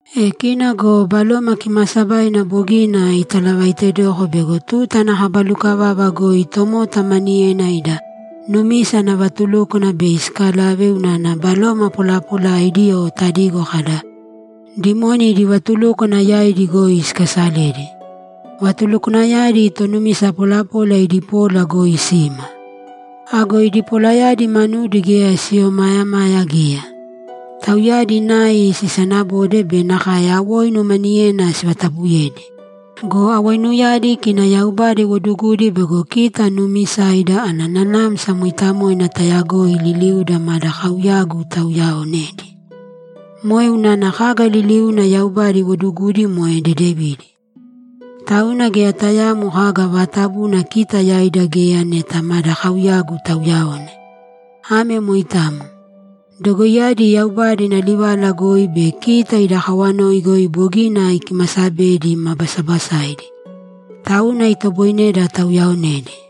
E kina go Baloma Kimaasabaina bogina italavaitedoko bego tuta ana kaba lukavava goi tomota maniyena ida numisa ana vatulúkwana bei sikalave unana baloma polapolaidi o tadigo kada, ‘Dimoni’ idi vatulúkwana yaidi goi sikasaledi. Vatulukwanayadi tonumisa polapola idi pola goi sima. Ago idi polayadi manudi geya siomaayamaya geya. Tauyadi nai sisanabode be nakae awoinu maniyena sivatabuyedi. Go awoinuyadi kina Yaubada iwodugudi bego kita nuumisaida ana Nanamsa Mooitamoina taayagoi liliuda mada kauyagu tauyaonedi. Moe unana kaga liliuna Yaubada iwodugudi moe dedevidi. Tauna geya tayaamo kaga vaatabuna kita yaida geya neta mada kauyagu tauyaone. Ame moitamo. Dogoiyadi Yaubada ina livala goi be kita ida kawanoi goi bogina ikimasabedi ma basabasaidi. Tauna itoboineda tauyaaonedi.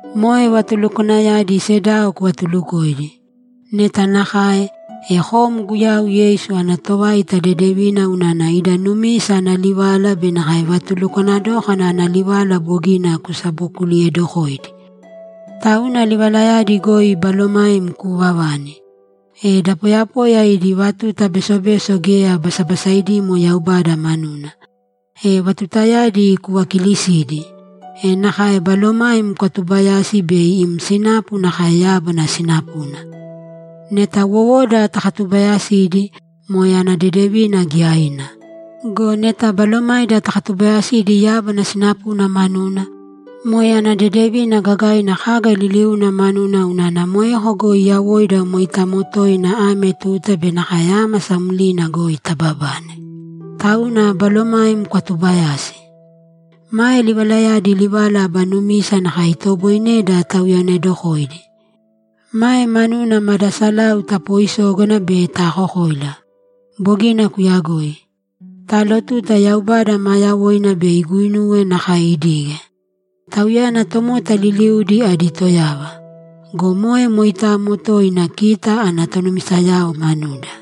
Moe vatulukwanayadi sedao kuvatuulukōidi. Neta nakae, e kom Guyau Yeisu ana tovaita dedevina unana ida numisa ana livala be nakae vatulukwana dókana ana livala bogina kusabokuliyedokoidi. Tauna livalayadi goi balomaim kuuvavani. E da poyapoya idi vatuta besobeso geya basabasaidimo Yaubada manuna. E vatutayadi kuvakiilisīdi. E nakae balomaim kwatubayāsi bei im sinapu nakae yábana sinapuna. Neta wowoda takatubaayasidi, moe ana dedevina giyaina. Go neta balomaida takatubaayasidi yábana sinapuna manuna, moe ana dedevina gagaina kaga liliuna manuna unana moeko goi yawoida moitamo toina ame tuta be nakae ámasa mlina goi tababane. Tauna balomaim kwatuubayāsi. Mae livalayadi livala aba numisa nakae itoboineda tauyaonedokoidi. Mae manuna mada salau tapooisógana be taakokoila! Bogina kuyagoi. Taalotuta Yaubada maa yawoina bei iguinuwe nakae idige. Tauyana tomota liliudi adi Toyava. Go moe moitamo toina kita ana tonumisayao manuda.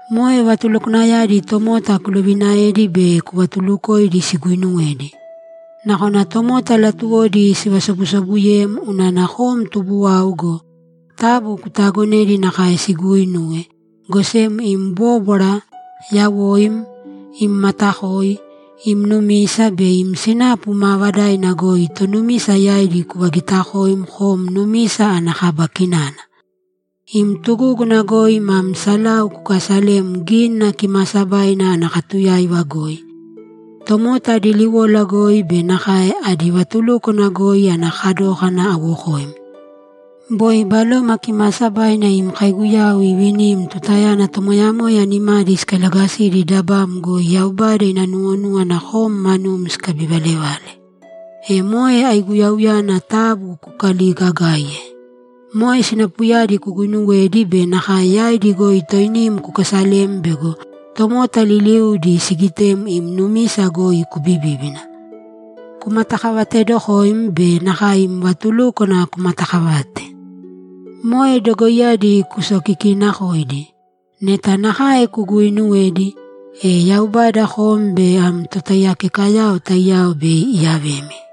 Moe vatulukwanayadi tomota kuloviinaēdi be kuvatuulukōidi siguuinuwedi. Nakona tomota latuwodi sivasobusobuyem unana kom tubuwau go, taabu kutaagonēdi nakae siguuinuwe, go sem im bóbwara, yawoim, im matakoi, im numisa be im sinapu maavadaina goi tonumisa yaidi kuvagiitakōim kom numisa ana kaba kinana. Imi tugúguna goi mam salau kukaasalēm Gínina Kimaasabaina ana katuyáiva goi, tomota adi liwola goi be nakae adi vatulúkwana goi ana kadókana awokoim. Boi Baloma Kimaasabaina im kaiguyau ivinim tutayana tomoyamoya nimadi sikailagasidi dabam goi Yaubada ina nuwonúwana kom manum sikabivalevale. E moe aiguyauyana taabu kukaligaagaīye. Moe sinapuyadi kuguuinuwēdi be nakae yaidi goi toinim kukaasalēm bego tomota liliudi sigitem im numisa goi kubibíbina. Kumatakavateedokōim be nakae im vatulúkwana kumataakavāte. Moe dogoiyadi kusokikiinakōidi. Neta nakae kuguuinuwedi, e Yaubada kom be am totaiyakekayao taiyao bei iyavemi.